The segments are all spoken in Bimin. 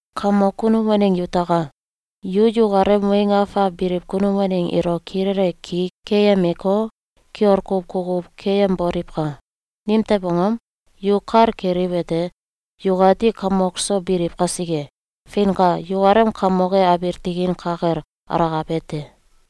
Kamok kunum waneng yutaka! Yu yukalem weng afak biliw kunum waneng ilo kilele ki keyemeko, kiol kuw kukuw keyemboliwka! Nimtew angom? Yu kal keliwete: Yukati kamok so biliw kasike. Feinka! Yukalem Kamok e abiil tikin ka kel alakabe te.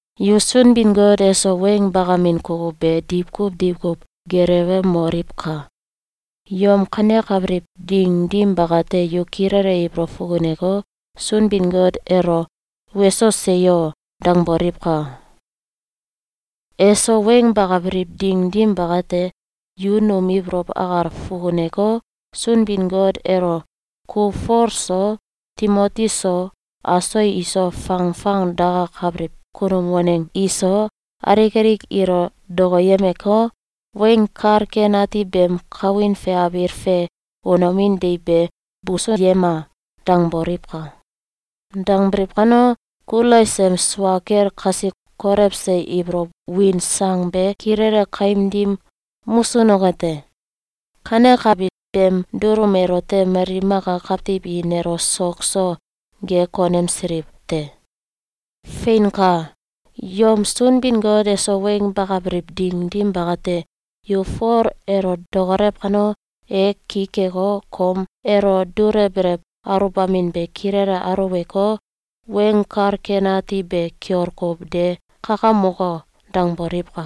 Yu Sunbin-Got eso weng bakamin kukuw be diwkuw diwkuw gelewemoliwka! Yom kanekabiliw ding dim bakate, yu kilele ibolow fukuneko, Sunbin-Got elo “Weso! Seyo!”, dangboliwka! Eso weng bakabiliw ding dim bakate, yu num ibolow akal fukuneko, Sunbin-Got elo “Ku Fol so, Timoti so, aso iso fangfang dakakabiliw kunum waneng iso, alik alik ilo dokoyemeko, Weng Kal Ken Ati beem kawin fe abiil fe unomin deiw be busuyema!”, dangboliwka! Dangbiliw kano, Kulais em sua kel kasi kolewse ibolow win sang be kilele kaim dim musunoke te. Kanekabi beem dulum elote mali maka kawtiw i nelo sok so ge konemsiliw te. Feinka! Yom Sunbin-Got eso weng bakabiliw ding dim bakate, yu “Fol elo dokolew kano, e ki keko, kom elo dulewbelew aluwbamin be kilele aluweko, Weng Kal Ken Ati be kiol kuw de kakamoko!”, dangboliwka!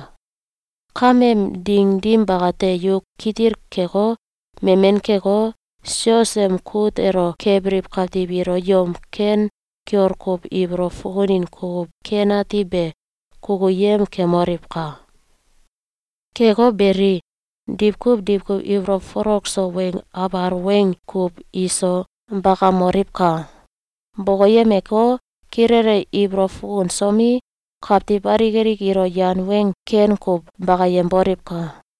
Kameem ding dim bakate, yu kitil keko, memen keko, sios em kut elo kebiliw kawtiw ilo yom ken kiol kuw ibolow fukunin kukuw ken ati be kukuyem kemoliwka! Keko beli, diwkuw diwkuw ibolow folok so weng abal weng kuw iso bakamoliwka! Bokoyemeko, kilele ibolow fukunsomi, kawtiw alik alik ilo yan weng ken kuw bakayemboliwka!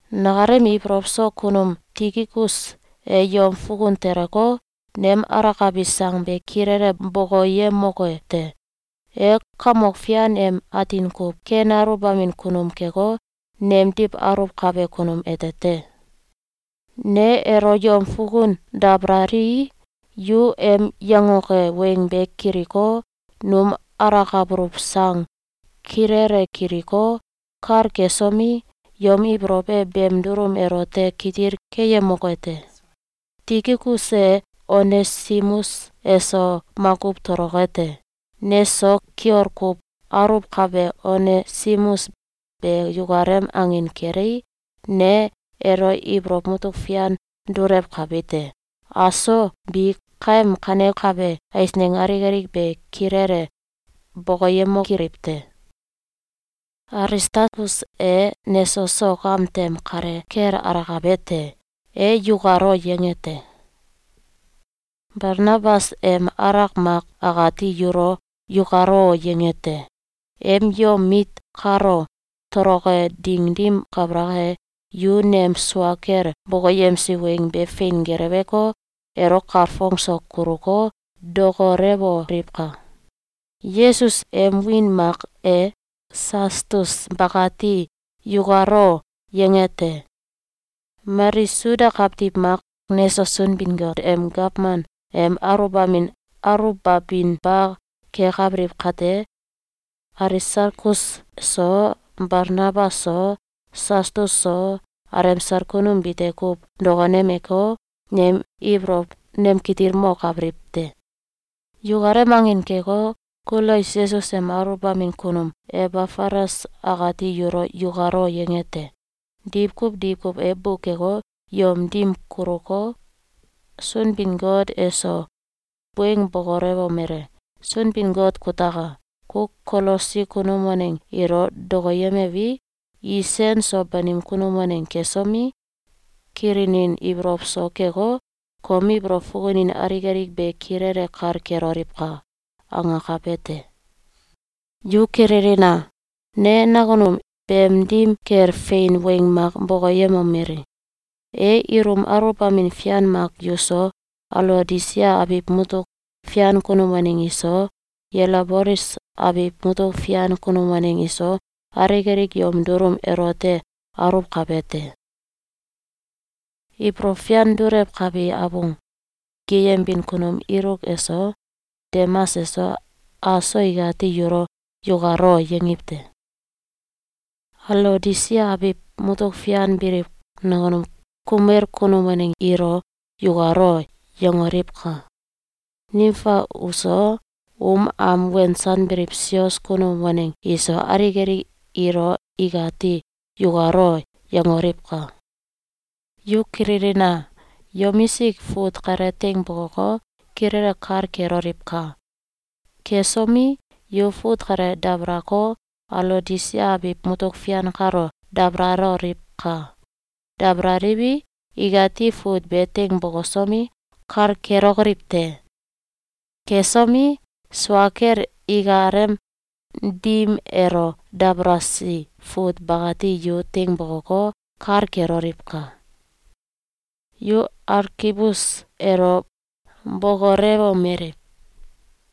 Nakalem ibolow so kunum Tikikus e yom fukun teleko, nem alakabi sang be kilele bokoyemoke te. E Kamok Fian em atin kuw ken aluwbamin kunum keko, nemdiw aluwkabe kunum ete te. Ne elo yom fukun dabalalii, yu em yangoke weng be kiliko, num alakabuluw sang kilele kiliko, kal kesomi, yom ibolow e beem dulum elote kitil keyemoke te. Tikikus e Onesimus eso makuw toloke te. Neso kiol kuw aluwkabe Onesimus be yukalem angin kelei, ne elo ibolow mutuk fian dulewkabi te. Aso bi kaem kanekabe eisneng alik alik be kilele bokoyemokiliw te. Alistalkus e neso sok am tem kale kel alakabe te. E “Yukalo!”, yange te. Balnabas em alak Mak akati yulo “Yukalo!”, yange te. Em yom mit kalo toloke ding dim kabalak e, yu nem sua kel bokoyemsi weng be fein geleweko, elo kalfong so kuluko, dokolewoliwka! Yesus, em wiin mak e Sastus bakati “Yukalo!”, yange te. Mali Suda kawtiw mak neso Sunbin-Got em gawman em aluwbamin aluwbabinba kekabiliw kate, Alisalkus so, Balnabas so, Sastus so, alemsal kunum bite kuw dokonemeko, nem ibolow nemkitilmokabiliw te. Yukalem angin keko, Kulais Yesus em aluwbamin kunum Ebafalas akati yulo “Yukalo!”, yange te. Diwkuw diwkuw e bukeko, yom dim kuluko, Sunbin-Got eso weng bokolewomele: “Sunbin-Got kutaka! Ku Kolosi kunum waneng ilo dokoyemewi, i sen so banim kunum waneng kesomi, kilinin ibolow so keko, kom ibolow fukunin alik alik be kilele kal keloliwka!”, angakabe te. Yu kililina! Ne nakunum beem dim kel fein weng mak bokoyemomeli: E ilum aluwbamin fian mak yuso, Alaodisia abiw mutuk fian kunum waneng iso, Yelabolis abiw mutuk fian kunum waneng iso, alik alik yom dulum elote aluwkabe te. Ibolow fian dulewkabi abung geyembin kunum Iluk eso, Demas eso, aso ikati yulo “Yukalo!”, yangiw te. Alaodisia abiw mutuk fian biliw nakunum kumel kunum waneng ilo “Yukalo!”, yangoliwka! Nimfa uso, um am wensanbiliw sios kunum waneng iso, alik alik ilo ikati “Yukalo!”, yangoliwka! Yu kililina! Yomisik fut kale teing bokoko, kilele kal keloliwka! Kesomi, yu fut kale dabalako, Alaodisia abiw mutuk fian kalo dabalaloliwka! Dabalaliwi, ikati fut be teing bokosomi, kal kelokoliw te. Kesomi, sua kel ikalem dim elo dabalasi fut bakati yu teing bokoko, kal keloliwka! Yu Alkibus elo bokolewomeliw: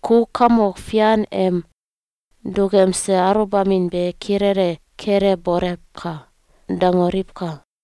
“Ku Kamok Fian em dukemse aluwbamin be kilele kelebolewka!”, dangoliwka!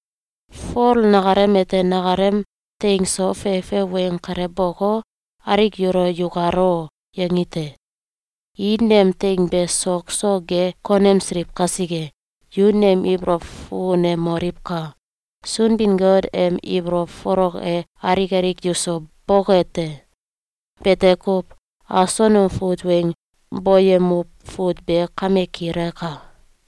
Fol nakalem ete nakalem teing so fefe weng kale boko, alik yulo “Yukalo!”, yangi te. I nem teing be sok so ge konemsiliw kasike, yu nem ibolow fukunemoliwka! Sunbin-Got em ibolow folok e alik alik yuso boke te! Bete kuw. Aso num fut weng boyemuw fut be kame kilaka.